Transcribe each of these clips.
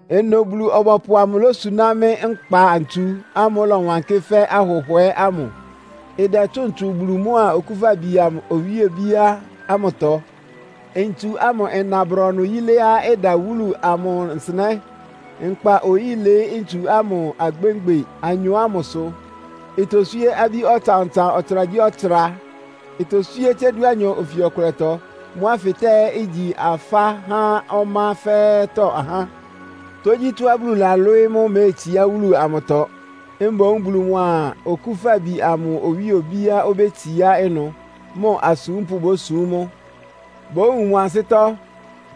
Ɩnʋ Bulu-ɔbɔpʋ amʋ losuná mɩ́ nkpa-ntsu ámʋ́ʋ́ ɩlɔwankɩ́ fɛ́ ahʋhwɛ́ ámʋ. Ɩdɛtsʋ́ʋn tsu Bulu mʋa Okúfabi amʋ owíe obíá ámʋtɔ. Ntsu ámʋ ɩna brɔnʋ yiléá ɩda wúlu amʋ nsɩnɛ́. Nkpa-oyí ɩlɩɩ́ ntsu ámʋ agbemgbe anyɔ ámʋsʋ, itoswíé abí ɔtsan-ɔtsan ɔtsragyíɔtsra. Itoswíé tsé dúanyɔ ofi ɔkʋlɛtɔ. Mʋ́ afɩtáa ɛ́ igyi afá há ɔmá fɛ́ɛ́tɔ́ ahá. Tógyítɔ́á Bulu lalwɩ́ɩ́ mʋ́ méetsiá wúlu amʋtɔ. Mboún Bulu mʋa Okúfabi amʋ owíe obíá obétsiá ɩnʋ, mʋ asúmpʋ́ bósum mʋ. Bówun mʋ ansɩ́tɔ́,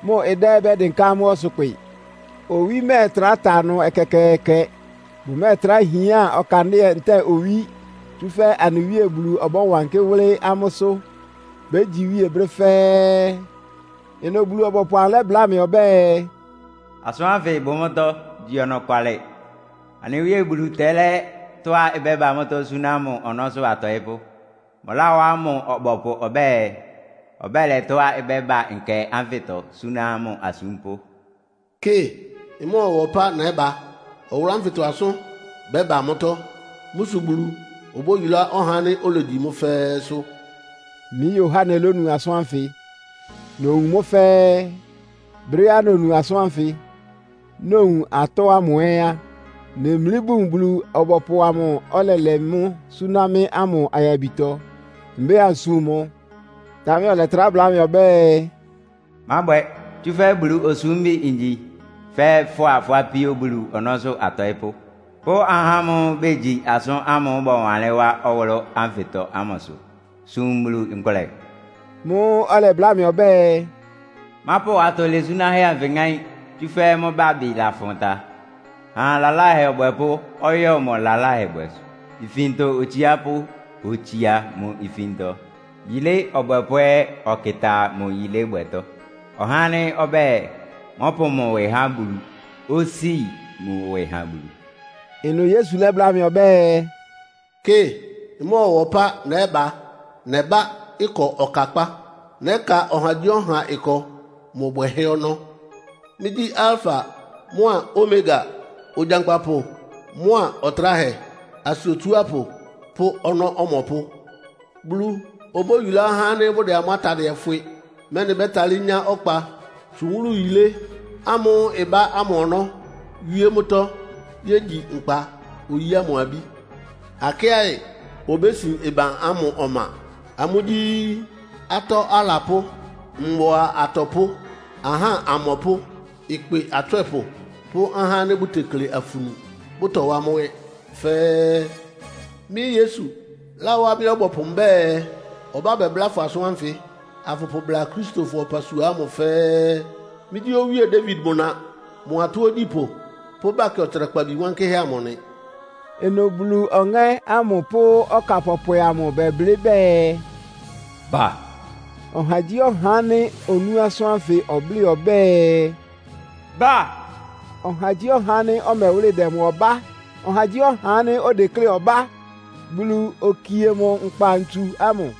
mʋ ɩdá ɛ́ bɛ́dɩnká amʋ́ ɔsʋkpɩ. Owí mɛ́ɛtrá ta ɩnʋ ɛkɛkɛɛkɛ. Bʋmɛ́ɛtrá hián ɔkandɩ́ɛ ntɛ́ɛ owí, tsúfɛ́ anɩ Wíe Bulu ɔbɔ́wankɩ́ wʋ́lɩ́ amʋ́sʋ́. Bégyi iwíe brɛ́ fɛ́ɛ́. Ɩnʋ Bulu-ɔbɔpʋ amʋ lɛ́bláa mɩ ɔbɛ́ɛ, “Asʋ́n ánfɩ bʋ mʋ́tɔ́, igyi ɔnɔkwalɩ. Anɩ Wíe Bulu tɛ́lɛ́ tɔ́á ɩbɛ́ba suná mʋ ɔnɔ́sʋ́ atɔɩ́pʋ́. Mʋláwá mʋ ɔbɔpʋ ɔbɛ́ɛ, ɔbɛ́lɛ tɔ́á ɩbɛ́ba nkɛ ánfɩtɔ suna mʋ asúmpʋ́.” “Kɩ! Ɩmɔ́ɔwa ɔpá nɛ́ba! Ɔwʋlʋ́ ánfɩtɔ asʋ́n bɛ́ba mʋ́tɔ́. Mʋ́ sʋ Bulu obóyulá ɔhá ánɩ́ olegyi mʋ́ fɛ́ɛ́sʋ́!” Mɩ́ Yohane lónu asʋ́n ánfɩ, nowun mʋ́ fɛ́ɛ́. Brɛ́á nonu asʋ́n ánfɩ, nowun atɔ́ ámʋ ɛ́ á, nemlí bun Bulu-ɔbɔpʋ amʋ́ʋ́ ɔlɛlɛ mʋ́ suná mɩ́ ámʋ ayabitɔ, mbɛ́ɛ ansum mʋ. Támɛ ɔlɛtrá bláa mɩ ɔbɛ́ɛ, “Mábwɛ! Tsúfɛ́ Bulu osúmbi ngyi fɛ́ fʋ́a fʋ́ apíó Bulu ɔnɔ́sʋ́ atɔɩ́pʋ́, pʋ́ ahá ámʋ́ʋ́ bégyi asʋ́n ámʋ́ʋ́ bɔwanlɩ́n wá ɔwʋlʋ́ ánfɩtɔ ámʋsʋ. Sum Bulu nkʋlɛ!” Mʋ́ʋ́ ɔlɛbláa mɩ́ ɔbɛ́ɛ, “Mápʋ atɔ lɛsúnáhɛ́ anfɩ ŋáín, tsúfɛ́ mʋ́ bábɩ lafʋn ta. Ha lalahɛ ɔbwɛpʋ́ ɔyɔ mʋ lalahɛbwɛsʋ. Ifintɔ otsiápʋ́ otsía mʋ ifintɔ, yilé ɔbwɛpʋ́ ɛ́ ɔkɩta mʋ yilébwɛtɔ. Ɔhá ánɩ́ ɔbɛ́ɛ, mɔ́pʋ mʋ ɩwɩ há Bulu osíi mʋ ɩwɩ ha Bulu.” Ɩnʋ Yesu lɛ́bláa mɩ ɔbɛ́ɛ, “Kɩ, ɩmɔ́ɔwa ɔpá nɛ́ba! Nɛbá ɩkɔ ɔkakpá. Nɛ́ka ɔhagyíɔha ɩkɔ mʋ bwɛhɛ́ ɔnɔ́. Mɩ́gyí Alfa mʋ́a Omega. Ogyankpapʋ mʋa Ɔtráhɛ, asɩ Otsuápʋ pʋ́ ɔnɔ́ Ɔmɔpʋ́. “Bulu obóyulá ahá ánɩ́ bʋdɛ amʋ́ atadɩɛ fwɩ, mɛ́nɩ bɛ́talɩ́ nyá ɔkpa tsʋn wúlu yilé ámʋ́ʋ́ ɩbá ámʋ ɔnɔ́ wíé mʋ́tɔ́ yégyi nkpa-oyí ámʋ abí. Akɩ́aɩ obésin ɩban ámʋ ɔma. Amʋ́ gyí; atɔ́ alapʋ́, mbʋa atɔpʋ́, ahá amɔpʋ́, ɩkpɩ atswɛ́pʋ pʋ́ ahá ánɩ́ bʋtekle afunu, bʋtɔwá mʋ́ ɛ́ fɛ́ɛ́. “Mɩ́ Yesu láwá mɩ́ ɔbɔpʋ mbɛ́ɛ, ɔbá bɛbláa fʋ asʋ́n ánfɩ, afʋpʋbla Akristofɔ ɔpasua ámʋ fɛ́ɛ́. Mɩ́gyí Owíe Dawid mʋ na, mʋ atɔ́ ogyípʋ́ pʋ́ Bakɛ Ɔtsrakpabi wankɩ́hɛ́ amʋ nɩ.” Ɩnʋ Bulu Ɔŋɛ́ ámʋ pʋ́ ɔká pɔpwɛ amʋ bɛblɩ́ bɛɛ, “Ba!” Ɔhagyíɔha ánɩ́ onú asʋ́n ánfɩ ɔblɩ́ ɔbɛ́ɛ, “Ba!” Ɔhagyíɔha ánɩ́ ɔmɛwʋ́lɩ dɛ mʋ ɔbá. Ɔhagyíɔha ánɩ́ odeklé ɔbá, Bulu okie mʋ nkpa-ntsu ámʋ.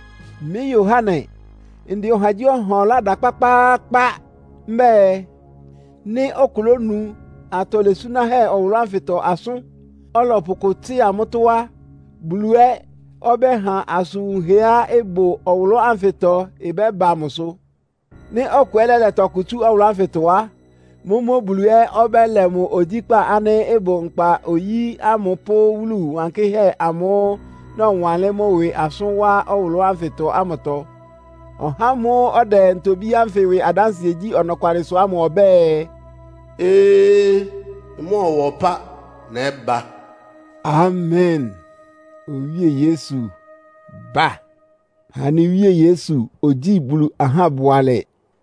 Mɩ́ Yohane, ndɛ ɔhagyíɔha ɔlá da kpákpáákpá. Mbɛ́ɛ, nɩ́ ɔkʋ lónu atɔ lɛsúnáhɛ́ ɔwʋlʋ́ ánfɩtɔ asʋ́n, ɔlɔpʋ kʋ tsɩ́a mʋ́tɔ́ á, Bulu ɛ́ ɔbɛ́ha asʋn wunhɛá ɩbʋ ɔwʋlʋ́ ánfɩtɔ ɩbɛ́ba mʋsʋ. Nɩ́ ɔkʋ ɛ́ lɛ́lɛ tɔkʋ tsú ɔwʋlʋ́ ánfɩtɔ á, mʋ́mʋ́ Bulu ɛ́ ɔbɛ́lɛ mʋ ogyíkpá ánɩ́ ɩbʋ nkpa-oyí ámʋ pʋ́ wúlu wankɩ́hɛ́ amʋ́ʋ́ nɔwanlɩ́n mʋ́ ɩwɩ asʋ́n wá ɔwʋlʋ́ ánfɩtɔ ámʋtɔ. Ɔhá ámʋ́ʋ́ ɔdɛ ntobí ánfɩ ɩwɩ adánsɩɛ gyí ɔnɔkwalɩsʋ ámʋ ɔbɛ́ɛ, “Ee! Ɩmɔ́ɔwa ɔpá nɛ́ba!” Amen! Owíe Yesu, ba! Anɩ Wíe Yesu ogyíi Bulu ahá bʋalɛ!